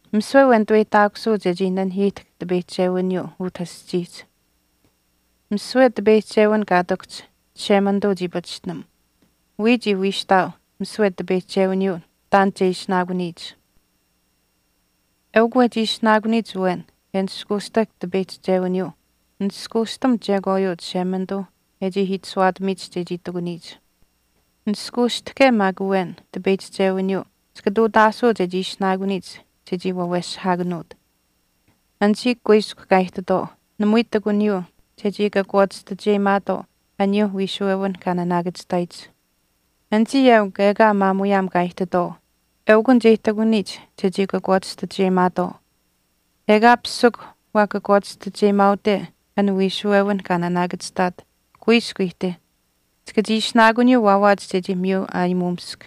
Misiwe awen nituweyihtaakusuu chechii nanihiihtahk tipeyihchewiniyuu utah aschiihch. Misiwe tipeyihchewin kaa ihtakuhch Chishemanituu chii pachishtinam. Wiya chii wiishtaau misiwe tipeyihchewiniyuu taan che ishinaakuniyich. Eukw wehchi ishinaakuniyich awen e nishkuushtahk tipeyihchewiniyuu nishkuushtam chekwaayuu Chishemanituuh e chii itashuwaatamiyich chechii ihtakuniyich. Nishkuushtahke maak awen tipeyihchewiniyuu chika ihtuutaasuu chechii ishinaakuniyich chechii waweshihaakanuut. Anichii kuiskw kaa ihtitwaau namui ihtakuniyuu chechii kakwaachistacheyimaatwaau aniyuuh wiishuwewinh kaa naanaakachihtaayich. Anichii eukw ekaa maamuyaam kaa ihtitwaau eukunich e ihtakuniyich chechii kakwaachistacheyimaatwaau. Ekaa pisikw waa kakwaachistacheyimaaute an wiishuwewinh kaa naanaakachihtaat kuiskw ihtih. Chika chii ishinaakuniyuu waawaach chechii miyu aayimuumisk.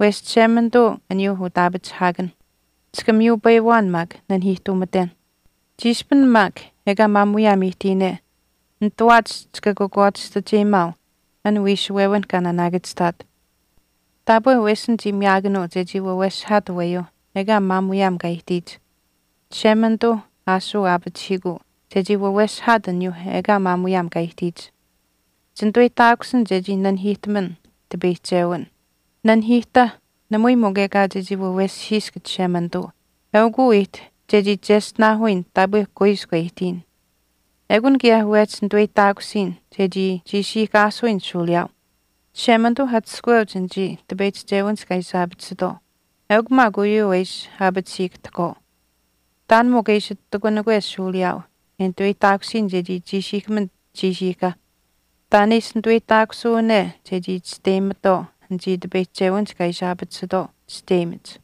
Wesh Chishemanituu aniyuuh utaapachihaakanh. Chika miyupayiwaan maak nanihiihtuumatenh. Chiishpin maak ekaa maamuyaam ihtiyine nitawaach chika kakwaachistacheyimaau an wiishuwewinh kaa naanaakachihtaat. Taapwe wesin chii miyaakanuu chechii waweshihaat aweyuuh ekaa maamuyaam kaa ihtiyich. Chishemanituuh aashuu aapachihiikuu chechii waweshihaat aniyuuh ekaa maamuyaam kaa ihtiyich. Chinituweyihtaakusin chechii nanihiihtaman tipeyihchichewin. Nanihiihtah namui mikw ekaa chechii waweshihisk Chishemanituu, eukuu ihtih chechii cheshtinaahuyin taapwe kuiskw e ihtiyin. Ekun kaye wehchi nituweyihtaakusiyin chechii chiishiihkaasuyin shuuliyaau. Chishemanituuh atushkuweuch anichii tipeyihchewinihch kaa ishi aapatisitwaau eukw maak uyuu e ishi aapatisiihkahtahkwaau. Taan mikw e ishi ihtakunikwe shuuliyaayuu e nituweyihtaakusiyin chechii chiishiihkaman chiishiihka. Taan e ishi nituweyihtaakusuune chechii chisteyimatwaau anichii tipeyihchewinihch kaa ishi aapatisitwaau chisteyimach.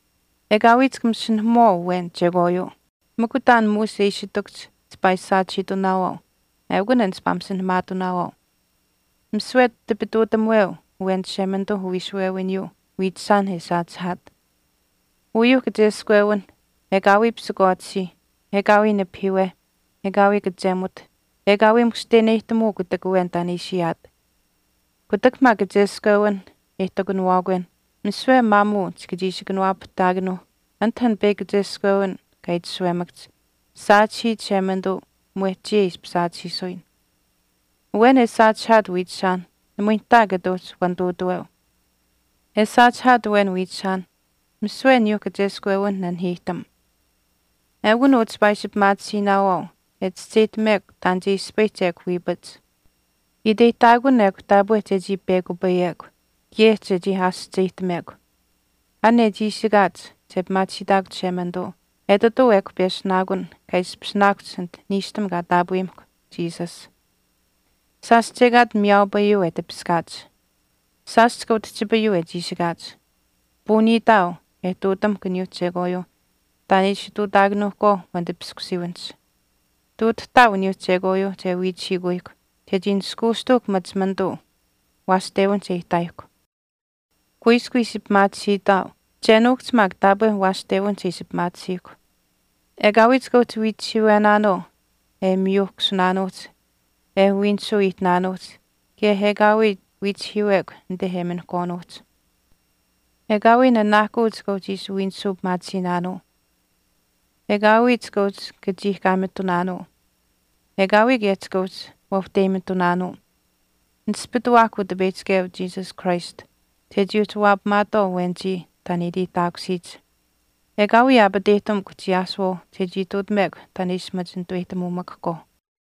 Ekaawii chika masinahamuwaau awen chekwaayuu. Mikw taan muush e ishi ihtakuhch chipaa ishi saachihiitunaawaau eukun an chipaa masinahamaatinaawaau. Misiwe tipituutamuweu awen Chishemanituuh uwiishuwewiniyuu wiichishaanh e saachihaat. Uyuuh kacheskwewinh, “Ekaawii pisikwaatisiih, ekaawii nipahiiweh, ekaawii kachemuth, ekaawii mushteneyihtamuu kutak awen taan e ishi ayaat.” Kutak maak kacheskwewinh e ihtakunawaakwenh, misiwe maamuu chika chii ishi kanawaapahtaakanuuh anit an peyakw kacheskwewin kaa itashuwemakahch, “Saachihii Chishemanituu mwehch chiya e ishpish saachihiisuyin.” Awen e saachihaat wiichishaanh namui nihtaa kata uhchi wanituutaweu. E saachihaat awen wiichishaanh misiwe aniyuuh kacheskwewinh nanihiihtam. Ekun uu chipaa ishi pimaatisiinaawaau e chischeyihtamekw taan che ispayihch ekw wiipach. Iteyihtaakun ekw taapwe chechii pekupayekw kaye chechii aasihcheyihtamekw. An e chiishikaach che pimaachihiitahkw Chishemanituu etituu ekw peshunaakun kaa ishpishinaakuhch anit niishtam kaa taapweyimahkw Jesus. Shaash chekaat miyaaupayuu e tipiskaach. Shaash chika utihchipayuu e chiishikaach. Puuniitaau e ihtuutamuhkw aniyuuh chekwaayuuh taan e ishi ihtuutaakanuuhkwaau wanitipiskuwiiwinihch. Ihtuutahtaau aniyuuh chekwaayuuh che wiichihiikuyihkw chechii nishkuushtuuhkw machimanituu waashtewinihch e ihtaayihkw. Kuiskw ishi pimaatisiitaau che nuukuhch maak taapwe waashtewinihch e ishi pimaatisiihkw. Ekaawii chika uhchi wiichihiiwenaanuu e miyuuhkasunaanuuhch e wiinisuu ihtinaanuuhch kaye ekaawii wiichihiiwekw anite e minihkwaanuuhch. Ekaawii nanaahkuu chika uhchi ishi wiinisuu pimaatisiinaanuu. Ekaawii chika uhchi kachiihkaamitunaanuu. Ekaawii kaye chika uhchi wauhteyimitunaanuu. Nispituwaahkw Utipeyihchikeu Jesus Christ chechii uhchi waapamaatwaau awenichii taan e iteyihtaakusiyich. Ekaawii aapateyihtamukw chiyaasuwaauh chechii ihtuutamekw taan e ishi machi nituweyihtamuumakahkwaauh.